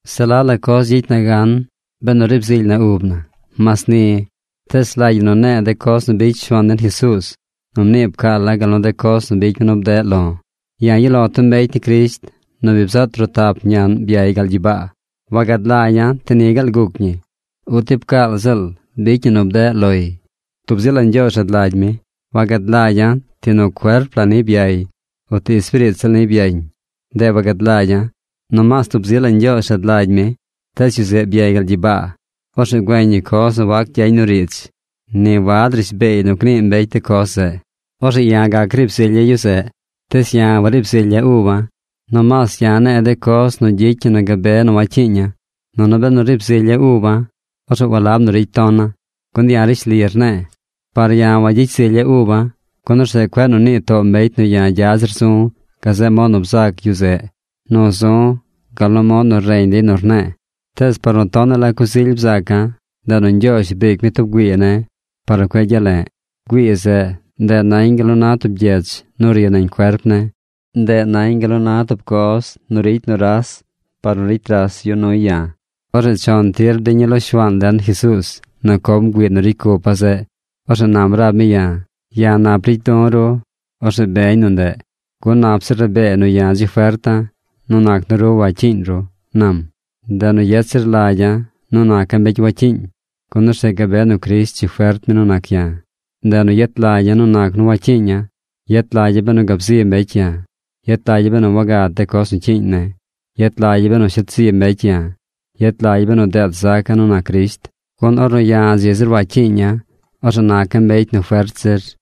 Se la la coz gyicy na gan benu riib zily na ub na. Mas ni, tees rlagy ñi nu ne̱e̱ de coz nu bicy Shuaan den Jesuuz nu mnii pcaala̱ gal nu de coz nu bicy mi nu bdeꞌ lo̱. Ya̱ yuꞌ lo̱ tub mbecy ni Crisht nu bi bzaꞌ trotap ñaꞌn byay gal gyibaa. Wagad lagya̱ ti ni gaal guc ñi, o ti pcaal ziꞌl bicy ñi nu bdeꞌ loy. Tub zi la Ñgyoozh rad lagy mi. Wagad lagya̱ ti nu cuerp la niy byay uti espiriit ziꞌl niy byañ. Ndeꞌ wagad lagya̱. Nomaas tub zi la Ñgyoozh rad lagy mi. Tees yu zeꞌ byay gal gyibaa. Orzeꞌ güeñ yu coz nu wac gyañ nu riidz. Ni wad rishbeey nu gnii mbecy de coz zeꞌ. Orzeꞌ ya̱ gac riib zilya̱ yu zeꞌ. Tees ya̱ wariib zilya̱ uba̱. Nomaas ya̱ ne̱e̱ de coz nu gyicy ñi nu gabe nu wacyiiña̱. Nunu benu riib zilya̱ uba̱, orzeꞌ walab nu ricy tona̱, gun ya̱ rishli rne̱e̱. Par ya̱ wayicy zilya̱ uba̱, gun orzeꞌ cueꞌ nu nii too mbecy nu ya̱ gya zir zu̱ gazeꞌ mod nu bzac yu zeꞌ nu zu̱ gal nu mod nu reñ dey nu rne̱e̱. Tees par nu tonaꞌ la coz ily bzaca̱, ndeꞌ nu Ñgyoozh briic mi tub güii ne̱ par nu cueꞌ gyale̱ꞌ. Güii zeꞌ, ndeꞌ nañ gal na tub gyech nu ri nañ cuerp ne̱. Ndeꞌ nañ gal na tub coz nu ricy nuras par nu ricy ras yu nuy ya̱. Orzeꞌ chon tir bdiña̱ lo Shuaan den Jesuuz nu com güii nu ricy cupa̱ zeꞌ. Orzeꞌ nam rab mi ya̱: “Ya̱ nap ricy du̱ ru. Orzeꞌ beñ nu ndeꞌ. Gun nap zir rabee nu ya̱ dzi ferta̱ nu nac nu ru wacyiiñ ru”, nam. Ndeꞌ nu yet zir lagya̱ nu naca̱ mbecy wacyiiñ, gun orzeꞌ gabe nu Crisht dzi fert mi nu nac ya̱. Ndeꞌ nu yet lagya̱ nu nac nu wacyiiña̱. Yet lagya̱ benu gab zi mbecy ya̱. Yet lagya̱ benu wagad de coz cyiiñ ne̱. Yet lagya̱ benu shet zi mbecy ya̱. Yet lagya̱ benu deet zaca̱ nu nac Crisht. Gun ornu ya̱ dzi zir wacyiiña̱, orzeꞌ naca̱ mbecy nu fert zir.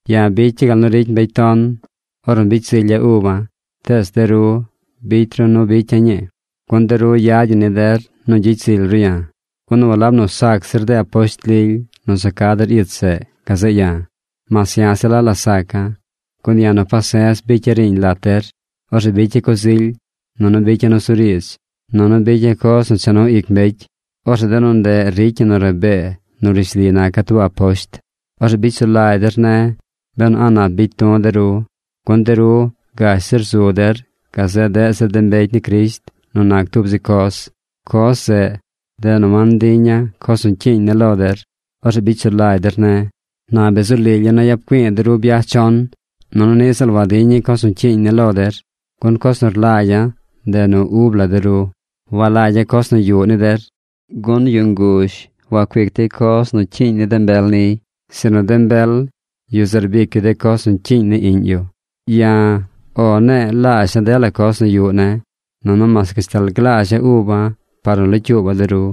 Ya̱ bicya̱ gal nu ricy mbecy ton ornu bicy zilya̱ uba̱, tees de ru bicy ru nu bicya̱ ñii. Gun de ru yad ñi ni der nu gyicy zily ru ya̱. Gun walab nu sac zir de aposht lily nu za ca der ich zeꞌ gazeꞌ ya̱, mas ya̱ se la la saca̱. Gun ya̱ nu pase̱z bicya̱ riiñ lat der. Orzeꞌ bicya̱ coz ily. Nunu bicya̱ nusuriidz. Nunu bicya̱ coz nu cha nu ic mbecy. Orzeꞌ de nu ndeꞌ ricy ñi nu rabee nu rishli naca̱ tub aposht. Orzeꞌ bicy sulagy der ne̱ benu a̱ꞌ nap bicy du̱ de ru. Gun de ru gash zir zu der gazeꞌ deꞌ zir mbecy ni Crisht nu nac tub zi coz. Coz zeꞌ, ndeꞌ nu wantiña̱ coz nu cyiiñ ne̱ lo der. Orzeꞌ bicy sulagy der ne̱. Na bi zu lilya̱ nu yap güi̱i̱ de ru byaj chon. Nunu niꞌ ziꞌl wadiña̱ coz nu cyiiñ ne̱ lo der. Gun coz nu rlagya̱, ndeꞌ ub la de ru. Walagya̱ coz nu yuꞌ ni der. Gun yu nguzh wacuic dey coz cyiiñ ni de mbel niy, sinu de mbel, yu zeꞌ rbic yu de coz nu cyiiñ ni iꞌñ yu. Ya̱ “O” ne̱e̱ laazha̱ dela coz nu yuꞌ ne̱, nunu mas gashtal glaazha̱ uba̱ par nu locyuuba̱ de ru.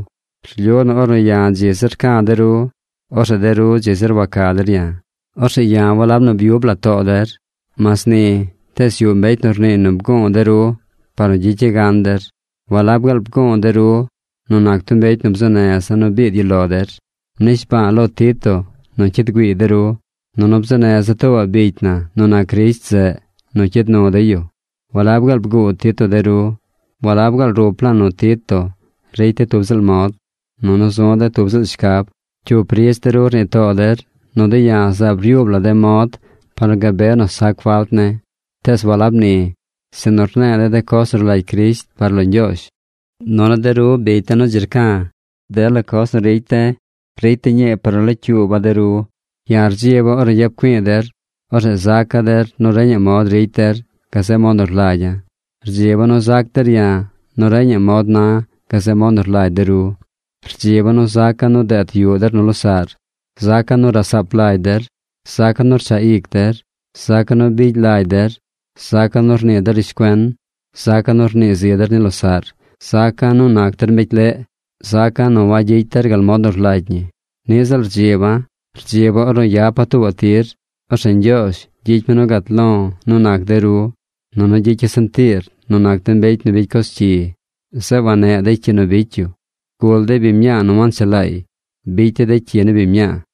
Rlyu nu ornu ya̱ dzi zir rca̱ de ru, orzeꞌ de ru dzi zir waca der ya̱. Orzeꞌ ya̱ walab nu byub la̱ too der. Mas ni, tees yuꞌ mbecy nu rniiy nu bgu̱u̱ de ru par nu gyicya̱ gan der. ¿Walab gaal nu bgu̱u̱ de ru nu nac tub mbecy nu bzuu neza̱ nu biid yu lo der? Mnishba̱a̱ lo Tito nu cyid güiiy de ru. Nunu bzuu neza̱ tuubaꞌ bicy na nu nac Crisht zeꞌ nu cyid nu dey yu. ¿Walab gaal bguu Tito de ru? ¿Walab gaal rup la̱a̱ nu Tito ricy de̱ tub ziꞌl mod, nunu zu̱ de̱ tub ziꞌl shcab? Cyup riidz de ru rnii too der nu de̱ ya̱ zaab ryuub la de̱ mod par nu gabe nu sac falt ne̱. Tees walab ni, sinu rne̱e̱ de̱ de coz nu rlagy Crisht par lo Ñgyoozh. Nunu de ru bicy de̱ nu dzi rca̱, dela coz nu ricy de̱ ricy de̱ ñii par nu locyuuba̱ de ru. Ya̱ rdziba̱ ornu yap güi̱i̱ der, orzeꞌ zaca̱ der nu reñaꞌ mod ricy der gazeꞌ mod nu rlagya̱. Rdziba̱ nu zac der ya̱ nu reñaꞌ mod na̱ gazeꞌ mod nu rlagy de ru. Rdziba̱ nu zaca̱ nu deet yuꞌ der nu losaꞌr. Zaca̱ nu rasaap lagy der. Zaca̱ nu rchaꞌ ic der. Zaca̱ nu bigy lagy der. Zaca̱ nu rnii der rishcuen. Zaca̱ nu rnii zi der ni losaꞌr. Zaca̱ nu nac der mbecy leꞌ. Zaca̱ nu wagyicy der gal mod nu rlagy ñi. Niꞌ ziꞌl rdziba̱. Rdziba̱ ornu yapa̱ tuubaꞌ tir, orzeꞌ Ñgyoozh gyicy mi nu gat lo̱ nu nac de ru. Nunu gyicya̱ sentiir nu nac de mbecy nu bicy coz cyi, zeꞌ wanneꞌ dey cyi nu bicy yu. Gul dey biñ mñaa nu wanchelaay. Bicy dey de cyi ni biñ mñaa.